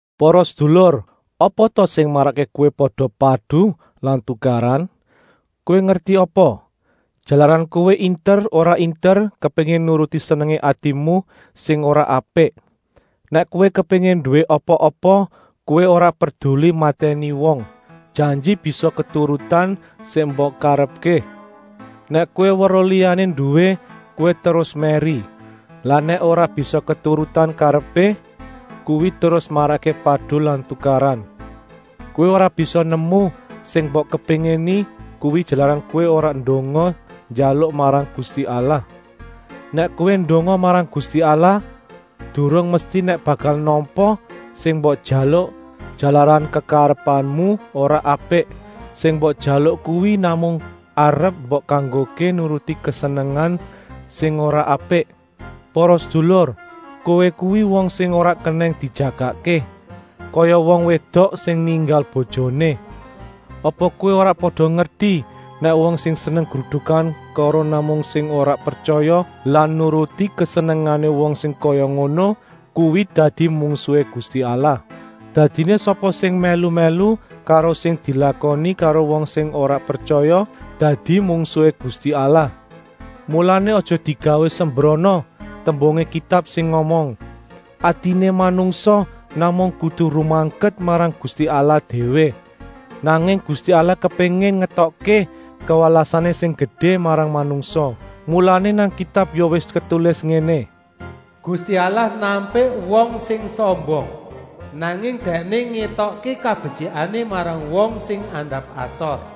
Para sedulur, apa ta sing marakké kowé pada padu lan tukaran? Kowé ngerti apa? Jalaran kowé inter ora inter kepéngin nuruti senengé atimu sing ora apik. Nèk kowé kepéngin nduwé apa-apa kowé ora perduli matèni wong, janji bisa keturutan sing mbok karepké. Nèk kowé weruh liyané nduwé, kowé terus mèri. Lah nèk ora bisa keturutan karepé, kuwi terus marakké padu lan tukaran. Kowé ora bisa nemu sing mbok kepéngini kuwi jalaran kowé ora ndonga njaluk marang Gusti Allah. Nèk kowé ndonga marang Gusti Allah, durung mesti nèk bakal nampa sing mbok jaluk, jalaran kekarepanmu ora apik; sing mbok jaluk kuwi namung arep mbok kanggokké nuruti kesenengan sing ora apik. Para sedulur, kowé kuwi wong sing ora kenèng dijagakké, kaya wong wédok sing ninggal bojoné. Apa kowé ora pada ngerti nèk wong sing seneng grudukan karo wong sing ora pretyaya lan nuruti kesenengané wong sing kaya ngono kuwi dadi mungsuhé Gusti Allah? Dadiné sapa sing mèlu-mèlu karo sing dilakoni karo wong sing ora pretyaya dadi mungsuhé Gusti Allah. Mulané aja digawé sembrana tembungé Kitab sing ngomong: “Atiné manungsa namung kudu rumaket marang Gusti Allah déwé.” Nanging Gusti Allah kepéngin ngétokké kawelasané sing gedé marang manungsa. Mulané nang Kitab ya wis ketulis ngéné: “Gusti Allah nampik wong sing sombong, nanging Dèkné ngétokké kabetyikané marang wong sing andap-asor.”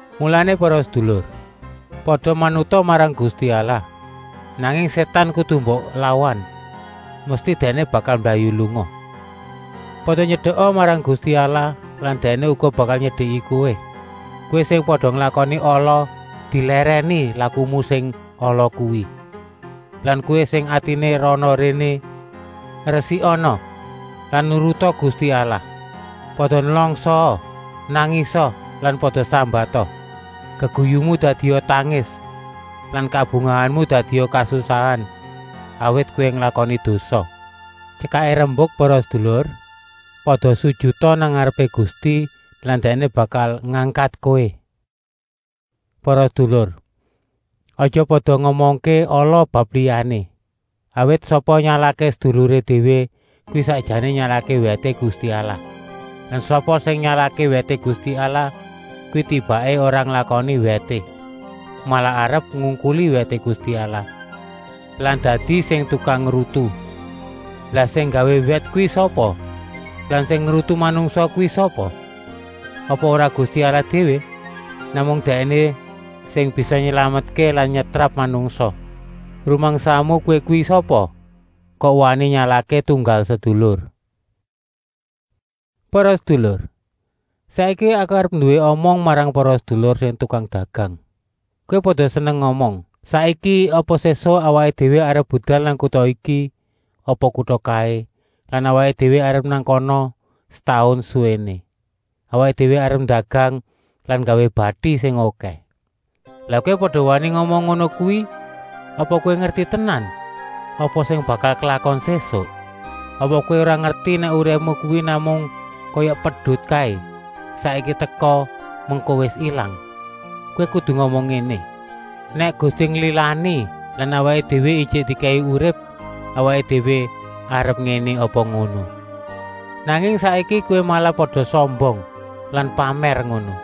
Mulané para sedulur, pada manuta marang Gusti Allah, nanging Sétan kudu mbok lawan, mesti dèkné bakal mblayu lunga. Pada nyedeka marang Gusti Allah lan Dèkné uga bakal nyedeki kowé. Kowé sing pada nglakoni ala, dilèrèni lakumu sing ala kuwi. Lan kowé sing atiné rana-réné, resikana lan nuruta Gusti Allah. Pada nlangsaa, nangisa lan pada sambata. Geguyumu dadia tangis lan kabungahanmu dadia kasusahan, awit kowé nglakoni dosa. Tyekaké rembuk para sedulur: pada sujuta nang ngarepé Gusti lan Dèkné bakal ngangkat kowé. Para sedulur, aja pada ngomongké ala bab liyané. Awit sapa nyalahké seduluré déwé kuwi sakjané nyalahké wèté Gusti Allah. Lan sapa sing nyalahké wèté Gusti Allah kuwi tibaké ora nglakoni wèté, malah arep ngungkuli wèté Gusti Allah lan dadi sing tukang ngrutu. Lah sing nggawé wèt kuwi sapa lan sing ngrutu manungsa kuwi sapa? Apa ora Gusti Allah déwé? Namung Dèkné sing bisa nylametké lan nyetrap manungsa. Rumangsamu kowé kuwi sapa kok wani nyalahké tunggal sedulur. Para sedulur, saiki aku arep nduwé omong marang para sedulur sing tukang dedagang. Kowé pada seneng ngomong: “Saiki apa sésuk awaké déwé arep budal nang kuta iki apa kuta kaé lan awaké déwé arep nang kana setaun suwéné. Awaké déwé arep ndagang lan nggawé bati sing okèh.” Lah kowé pada wani ngomong ngono kuwi apa kowé ngerti tenan apa sing bakal klakon sésuk? Apa kowé ora ngerti nèk uripmu kuwi namung kaya pedut kaé, saiki teka, mengko wis ilang. Kowé kudu ngomong ngéné: “Nèk Gusti nglilani lan awaké déwé ijik dikèki urip awaké déwé arep ngéné apa ngono.” Nanging saiki kowé malah pada sombong lan pamèr ngono.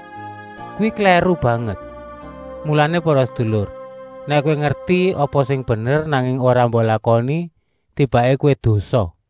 Kuwi klèru banget. Mulané para sedulur, nèk kowé ngerti apa sing bener nanging ora mbok lakoni, tibaké kowé dosa.